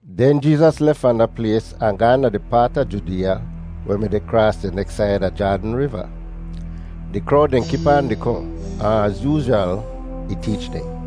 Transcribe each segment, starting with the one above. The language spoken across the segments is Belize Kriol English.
Den Jeezas lef fahn da plays ahn gaahn da di paat a Judeeya weh mi deh kraas di neks said a Jaadn Riva. Di krowd dehn kip aan di kohn, ahn az yoozhwal, ih teech dehn.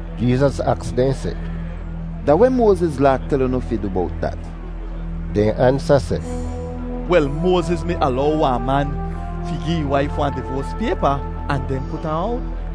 Jeezas aks dehn seh, “Da weh Moaziz Laa tel unu fi du bowt dat?” Dehn ansa seh, “Wel, Moaziz mi alow wahn man fi gi ih waif wahn divoas paypa ahn den put ahn owt.”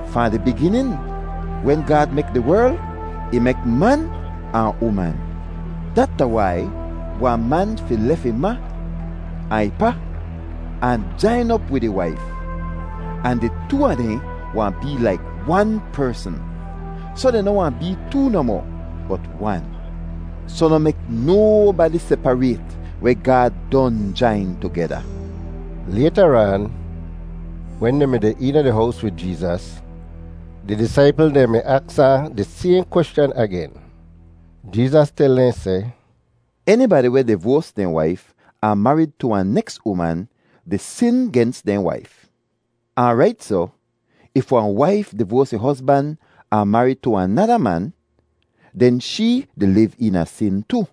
Fahn di biginin, wen Gaad mek di werl, ‘Ih mek man ahn uman.’ ‘Dat da wai wahn man fi lef ih ma ahn ih pa ahn jain op wid ih waif, ahn di too a dehn wahn bee laik wan persn.’ Soh dehn noh wahn bee too nohmoh, bot wan. Soh noh mek nobadi separayt weh Gaad don jain tugeda.” Laytaraan, wen dehn mi deh eena di hows wid Jeezas, di disaipl dehn mi aks ahn di sayhn kweschan agen. Jeezas tel dehn seh, “Enibadi weh divoas dehn waif ahn marid tu wahn neks uman di sin gens dehn waif. Ahn rait soh, if wahn waif divoas ih hozban ahn marid tu wahn nada man, den shee di liv eena sin tu.”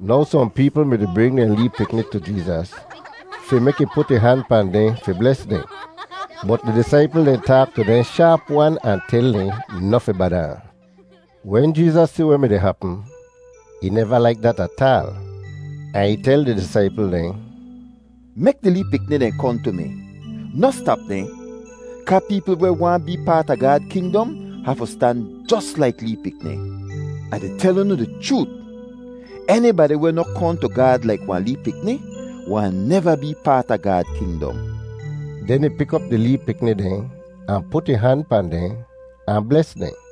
Now sohn peepl mi-di bring dehn lee pikni tu Jeezas fi mek ih put ih han pahn dehn fi bles dehn. Bot di disaipl dehn taak tu dehn shaap-wan ahn tel dehn noh fi bada ahn. Wen Jeezas si weh mi-di hapm, ih neva laik dat ataal ahn ih tel di disaipl dehn, “Mek di lee pikni dehn kohn tu mi. Noh stap dehn, kaa peepl weh waahn bee paat a Gaad kingdom hafu stan jos laik lee pikni. Ah di tel unu di chroot, enibadi weh noh kohn tu Gaad laik wahn lee pikni wahn neva bee paat a Gaad kingdom.” Den ih pik op di lee pikni dehn ahn put ih han pahn dehn ahn bles dehn.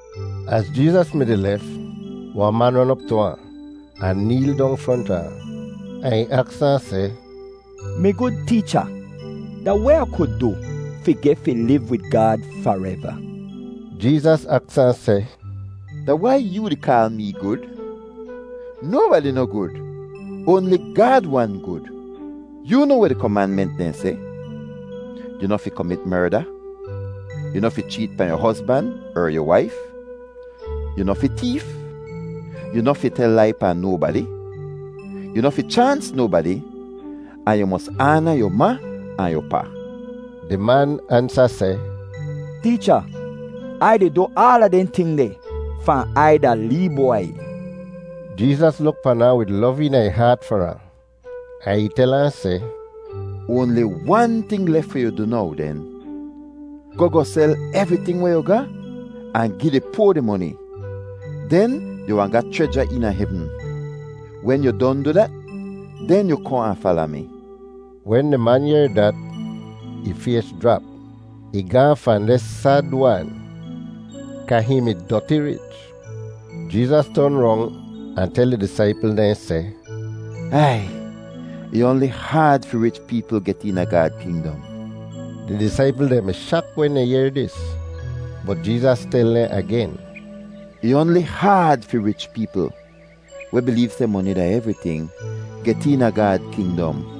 Az Jeezas mi-di lef, wahn man ron op tu ahn, ahn neel dong fronta ahn, ahn ih aks ahn seh, “Mi gud Teecha, da weh Ah ku du fi geh fi liv wid Gaad fareva?” Jeezas aks ahn seh, “Da wai yoo di kaal mee gud? Nobadi noh gud; oanli Gaad wan gud. Yoo noa weh di komanment dehn seh: ‘Yu noh fi komit merda, yu noh fi cheet pahn yu hozban er yu waif, yu noh fi teef, yu noh fi tel lai pahn nobadi, yu noh fi chaans nobadi, ahn yu mos aana yu ma ahn yu pa.’” Di man ansa seh, “Teecha, Ai di du aala dehn ting deh fahn Ai da lee bwai.” Jeezas luk pan ahn wid lov eena ih haat far ahn, ahn ih tel ahn seh, “Oanli wan ting lef fi yu du now den. Goh goh sel evriting weh yu ga ahn gi di poa di moni, den yu wahn ga chreja eena hevn. Wen yu don du dat, den yu kohn ahn fala mi.” Wen di man yehr dat, ih fays jrap. Ih gaahn fahn deh sad-wan kaa hihn mi doti rich. Jeezas ton rong ahn tel ih disaipl dehn seh, “Ai! Ih oanli haad fi rich peepl get eena Gaad kingdom.” Di disaipl dehn mi shak wen dehn yehr dis, bot Jeezas tel dehn agen, “Ih oanli haad fi rich peepl [weh bileev seh moni da evriting] get eena Gaad kingdom.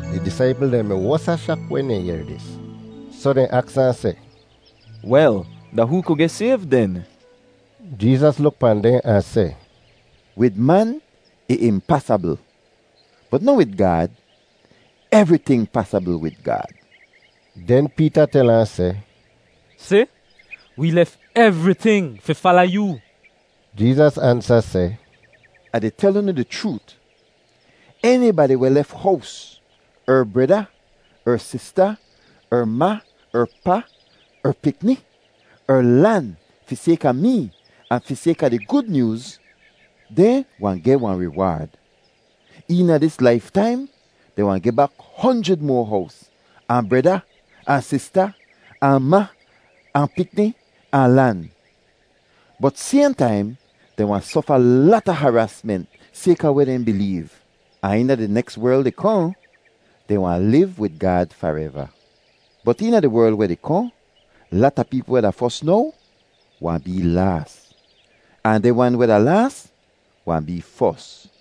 Di disaipl dehn mi wosa shak wen dehn yehr dis, soh dehn aks ahn seh, “Wel, da hoo ku geh sayv den?” Jeezas luk pahn dehn ahn seh, “Wid man ih impasabl, bot noh wid Gaad. Evriting pasabl wid Gaad.” Den Peeta tel ahn seh, “Si, wee lef evriting fi fala yoo.” Jeezas ansa seh, “Ah di tel unu di chroot, enibadi weh lef hows, er breda, er sista, er ma, er pa, er pikni, er lan fi sayka mee ahn fi sayka di Gud Nyooz, dehn wahn geh wahn riwaad. Eena dis laiftaim dehn wahn geh bak honjrid moa hows, ahn breda, ahn sista, ahn ma, ahn pikni, ahn lan. Bot sayhn taim dehn wahn sofa lata haraasment sayka weh dehn bileev. Ahn eena di neks werl di kohn, dehn wahn liv wid Gaad fareva. Bot eena di werl weh di kohn, lata peepl weh da fos now wahn bee laas, ahn dehn wan weh da laas wahn bee fos.”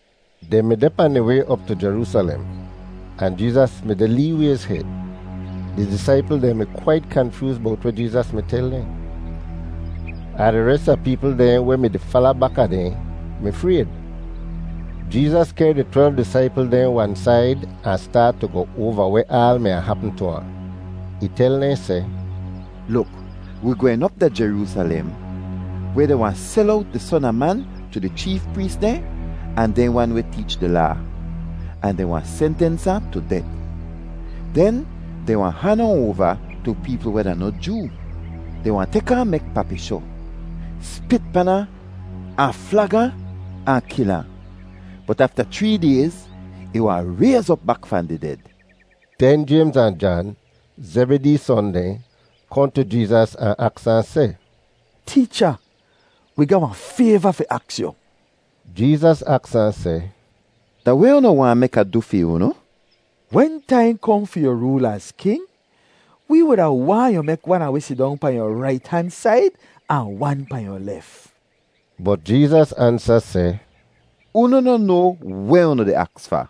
Dehn mi deh pahn dehn way op tu Jeroosalem, ahn Jeezas mi deh lee wayz hed. Di disaipl dehn mi kwait kanfyooz bowt weh Jeezas mi tel dehn, ahn di res a peepl dehn weh mi-di fala baka dehn mi frayd. Jeezas kehr di twelv disaipl dehn wan said ahn staat tu goh oava weh aal mi wahn hapm tu ahn. Ih tel dehn seh, “Luk, wi gwehn op da Jeroosalem weh dehn wahn sel owt di Son a Man tu di cheef prees dehn ahn dehn wan weh teech di Laa, ahn dehn wahn sentens ahn tu det. Den dehn wahn han ahn oava tu peepl weh da noh Joo. Dehn wahn tek ahn mek papishoh, spit pan ahn, ahn flag ahn, ahn kil ahn, bot afta chree dayz ih wahn rayz op bak fahn di ded!” Den Jaymz ahn Jan, Zebidee son dehn, kohn tu Jeezas ahn aks ahn seh, “Teecha, wi ga wahn fayva fi aks yu.” Jeezas aks ahn seh, “Da weh unu waahn mek Ah du fi unu?” “Wen taim kohn fi yu rool az king, wi wuda waahn yu mek wan a wi sidong pahn yu rait han said ahn wan pahn yu lef.” Bot Jeezas ansa seh, “Unu noh noa weh unu di aks fa.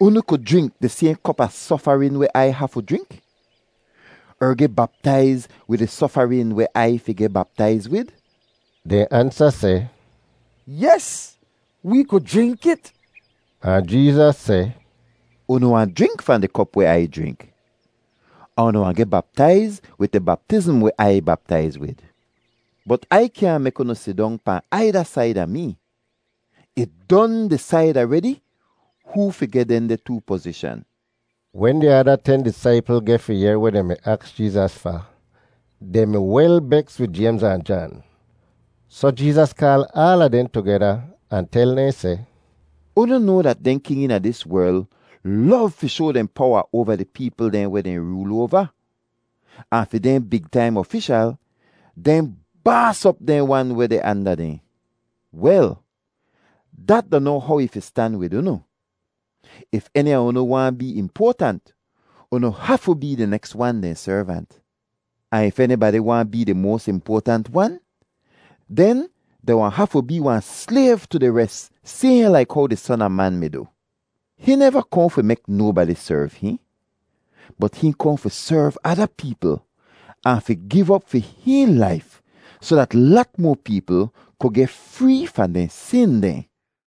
Unu ku jrink di sayhn kop a sofarin weh Ai hafu jrink? Er geh baptaiz wid di sofarin weh Ai fi geh baptaiz wid?” Dehn ansa seh, “Yes, wee ku jrink it.” Ahn Jeezas seh, “Unu wahn jrink fahn di kop weh Ai jrink, ahn unu wahn geh baptaiz wid di baptizm weh Ai baptaiz wid, bot Ai kyaahn mek unu sidong pahn aida said a mee. Ih don disaid aredi hoo fi geh dehndeh too pozishan.” Wen di ada ten disaipl geh fi yehr weh dehn mi aks Jeezas fa, dehn mi wel beks wid Jaymz ahn Jan. Soh Jeezas kaal aala dehn tugeda ahn tel dehn seh, “Unu noa dat dehn king eena dis werl lov fi shoa dehn powa oava di peepl dehn weh dehn rool oava, ahn fi dehn big taim ofishal dehn baas op dehn wan weh deh anda dehn. Wel, dat da noh how ih fi stan wid unu. If eni a unu waahn bee impoatant, unu hafu bee di neks wan dehn servant. Ahn if enibadi waahn bee di moas impoatant wan, den dehn wahn hafu bee wahn slayv tu di res sayhn laik how di Son a Man mi du. Hihn neva kohn fi mek nobadi serv hihn, bot hihn kohn fi serv ada peepl ahn fi giv op fi hihn laif soh dat lat moa peepl ku geh free fahn dehn sin dehn.”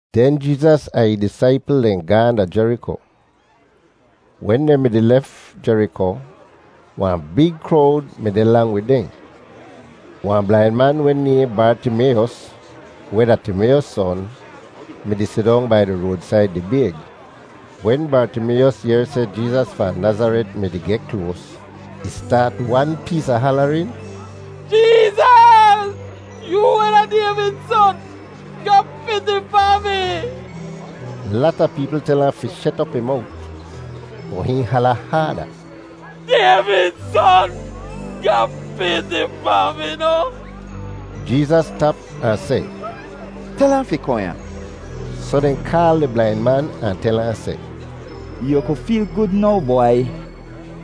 Den Jeezas ahn ih disaipl dehn gaahn da Jeriko. Wen dehn mi-di lef Jeriko, wahn big krowd mi deh lang wid dehn. Wahn blain man weh nayhn Bartimayos, weh da Timayos son, mi-di sidong bai di roadsaid di bayg. Wen Bartimayos yehr seh Jeezas fahn Nazaret mi-di geh kloas, ih staat wan pees a halarin, “Jeezas, yoo weh da Dayvid Son, ga piti pahn mi!” Lata peepl tel ahn fi shet op ih mowt, bot hihn hala haada, “Dayvid Son, ga piti pahn mi noh!” Jeezas stap ahn seh, “Tel ahn fi kohn ya.” Soh dehn kaal di blain man ahn tel ahn seh, “Yu ku feel gud now, bwai,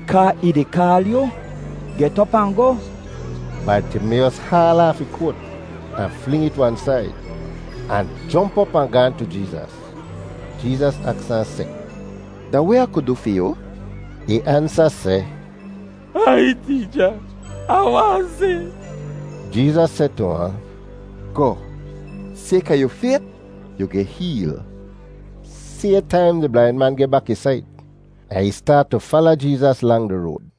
kaa ih di kaal yu. Get op ahn goh!” Bartimayos haal aaf ih koat ahn fling it wan said, ahn jomp op ahn gaahn tu Jeezas. Jeezas aks ahn seh, “Da weh Ah ku du fi yu?” Ih ansa seh, “Aiy, Teecha, Ah waahn si!” Jeezas seh tu ahn, “Goh; sayka yu fayt, yu geh heel.” Sayhn taim di blain man geh bak ih sait, ahn ih staat tu fala Jeezas lang di road.